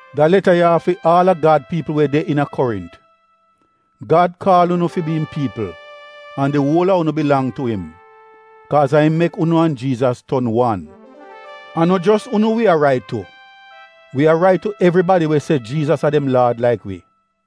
Da leta ya a fi aal a Gad piipl we de iina Korint. Gad kaal unu fi bi im piipl an di uol a unu bilang tu im, kaaz a im mek unu an Jiizas ton wan. A no jos unu wi a rait tu — wi a rait tu evribadi we se Jiizas a dem Laad laik wi.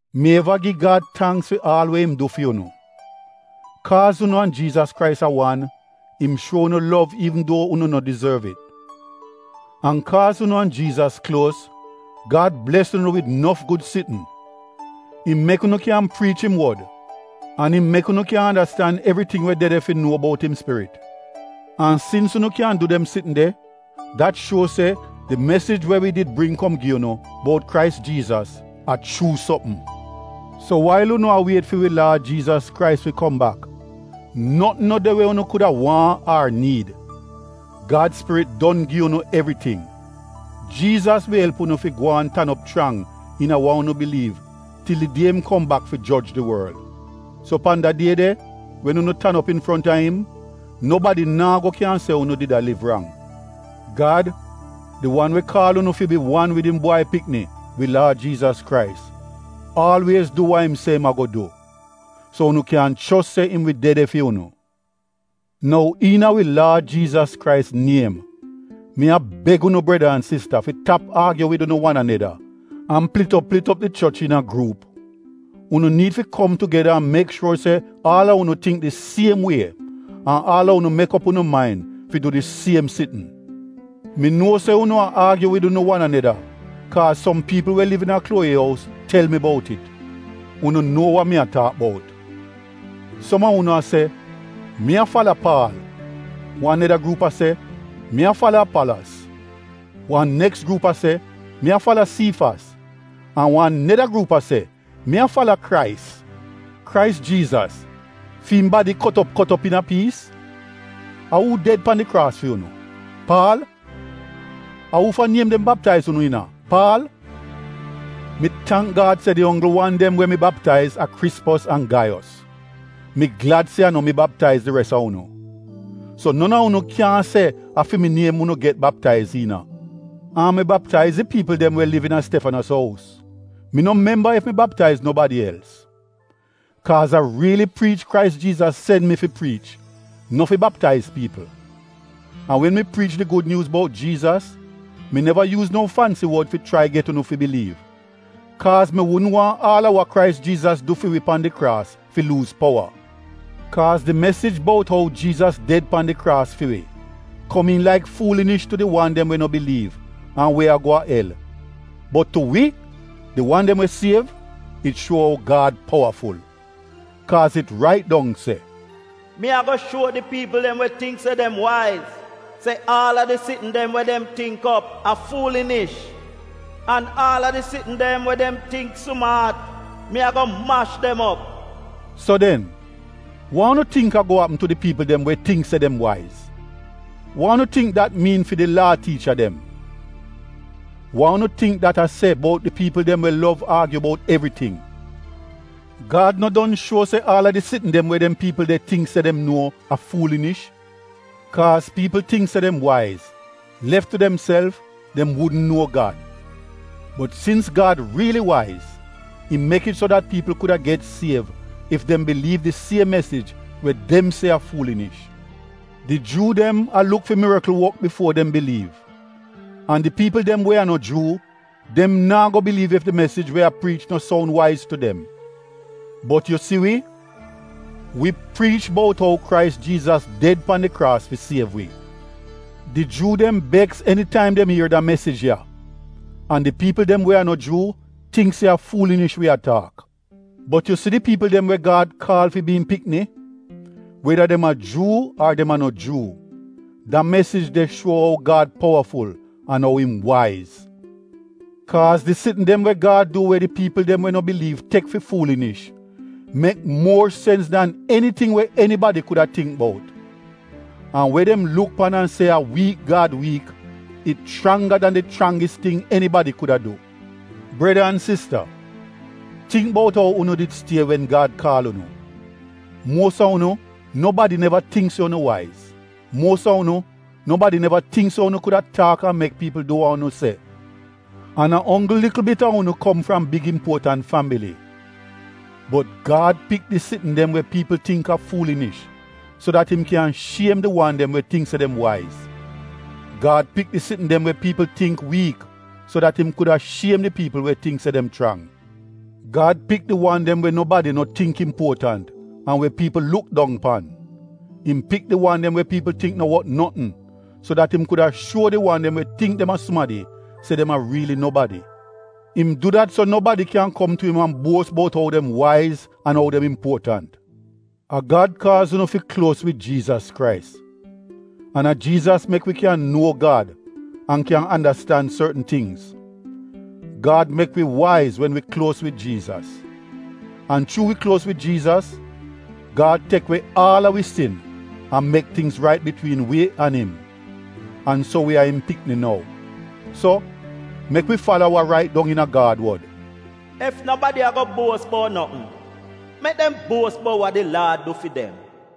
Mi eva gi Gad tangks fi aal we im du fi unu. Kaaz unu an Jiizas Krais a wan, im shuo unu lov iivn duo unu no dizorv it. An kaaz unu an Jiizas kluos, Gad bles unu wid nof gud sitn. Im mek unu kyan priich im wod an im mek unu kyan andastan evriting we de de fi nuo bout im Spirit. An sins unu kyan du dem sitn de, dat shuo se di mesij we wi did bring kom gi unu bout Krais Jiizas — a chuu sopm. So wail unu a wiet fi wi Laad Jiizas Krais fi kom bak notn no de we unu kuda waahn ar niid. Gad Spirit don gi unu evriting. Jiizas wi elp unu fi gwaan tan op chrang iina wa unu biliiv til di die im kom bak fi joj di worl. So pan da die de wen unu tan op infronta im, nobadi naa go kyan se unu did a liv rang. Gad, di wan we kaal unu fi bi wan wid im Bwai Pikni, wi Laad Jiizas Krais, aalwiez du wa im se im a-go du. So unu kyan chos se im wi de de fi unu. Nou iina wi Laad Jiizas Krais niem, mi a beg unu breda an sista fi tap aagyu wid unu wan aneda an plit op plit op di choch iina gruup. Unu niid fi kom tugeda an mek shuor se aal a unu tingk di siem wie an aal a unu mek op unu main fi du di siem sitn. Mi nuo se unu a aagyu wid unu wan aneda kaaz som piipl we liv iina Klowi ous tel mi bout it. Unu nuo wa mi a taak bout. Som a unu a se, “Mi a fala Paal.” Wan neda gruup a se, “Mi a fala Apalos.” Wan neks gruup a se, “Mi a fala Siifas” an wan neda gruup a se, “Mi a fala Krais.” Krais Jiizas, fi im badi kot op kot op iina piis? A uu ded pan di kraas fi unu? Paal? A uufa niem dem baptaiz unu iina? Paal? Mi tangk Gad se di onggl wan dem we mi baptaiz a Krispos an Gaiyos. Mi glad se a no mi baptaiz di res a unu. So non a unu kyaahn se a fi mi niem unu get baptaiz iina. (An mi baptaiz di piipl dem we liv iina Stefanos ous, mi no memba ef mi baptaiz nobadi els.) Kaaz a riili priich Krais Jiizas sen mi fi priich, no fi baptaiz piipl. An wen mi priich di Gud Nyuuz bout Jiizas mi neva yuuz no fansi wod fi chrai get unu fi biliiv, kaaz mi wudn waahn aal a wa Krais Jiizas du fi wi pan di kraas fi luuz powa. Kaaz di mesij bout ou Jiizas ded pan di kraas fi wi, komiin laik fuulinish tu di wan dem we no biliiv an we a-go go a el. Bot tu wi, di wan dem we siev, it shuo ou Gad powaful. Kaaz it rait dong se: “Mi a-go shuo di piipl dem we tingk se dem waiz se aal a di sitn dem we dem tingk op, a fuulinish. An aal a di sitn dem we dem tingk sumaat, mi a-go mash dem op.” So den, wa unu tingk a-go apm tu di piipl dem we tingk se dem waiz? Wa unu tingk dat miin fi di Laa tiicha dem? Wa unu tingk dat a se bout di piipl dem we lov aagyu bout evriting? Gad no don shuo se aal a di sitn dem we dem piipl de tingk se dem nuo a fuulinish? Kaaz piipl tingk se dem waiz, lef tu demself, dem wudn nuo Gad. Bot sins Gad riili waiz, im mek it so dat piipl kuda get siev ef dem biliiv di siem mesij we dem se a fuulinish. Di Juu dem a luk fi mirikl wok bifuo dem biliiv an di piipl dem we a no Juu, dem naa go biliiv ef di mesij we a priich no soun waiz tu dem. Bot yu si wi, wi priich bout ou Krais Jiizas ded pan di kraas fi siev wi. Di Juu dem beks enitaim dem ier da mesij ya an di piipl dem we a no Juu tingk se a fuulinish wi a taak. Bot yu si di piipl dem we Gad kaal fi bi im pikni, weda dem a Juu ar dem a no Juu, da mesij de shuo ou Gad powaful an ou im waiz. Kaaz di sitn dem we Gad du we di piipl dem we no biliiv tek fi fuulinish, mek muor sens dan eniting we enibadi kuda tingk bout. An we dem luk pan an se a wiik Gad wiik, it chrangga dan di chrangis ting enibadi kuda du. Breda an sista, tingk bout ou unu did stie wen Gad kaal unu. Muos a unu, nobadi neva tingk se unu waiz. Muos a unu, nobadi neva tingk se unu kuda taak an mek piipl du wa unu se. An a onggl likl bit a unu kom fram big impuotant fambili. Bot Gad pik di sitn dem we piipl tingk a fuulinish, so dat im kyan shiem di wan dem we tingk se dem waiz. Gad pik di sitn dem we piipl tingk wiik, so dat im kuda shiem di piipl we tingk se dem chrang. Gad pik di wan dem we nobadi no tingk impuotant an we piipl luk dong pan. Im pik di wan dem we piipl tingk no wot notn so dat im kuda shuo di wan dem we tingk dem a sumadi se dem a riili nobadi. Im du dat, so nobadi kyan kom tu im a buos bout ou dem waiz an ou dem impuotant. A Gad kaaz unu fi kluos wid Jiizas Krais. An a Jiizas mek wi kyan nuo Gad an kyan andastan sortn tingz — Gad mek wi waiz wen wi kluos wid Jiizas. An chuu wi kluos wid Jiizas, Gad tek we aal a wi sin an mek tingz rait bitwiin wi an im. An so wi a im pikni nou. So, mek wi fala wa rait dong iina Gad wod, “Ef nobadi a-go buos bout notn, mek dem buos bout wa di Laad du fi dem.”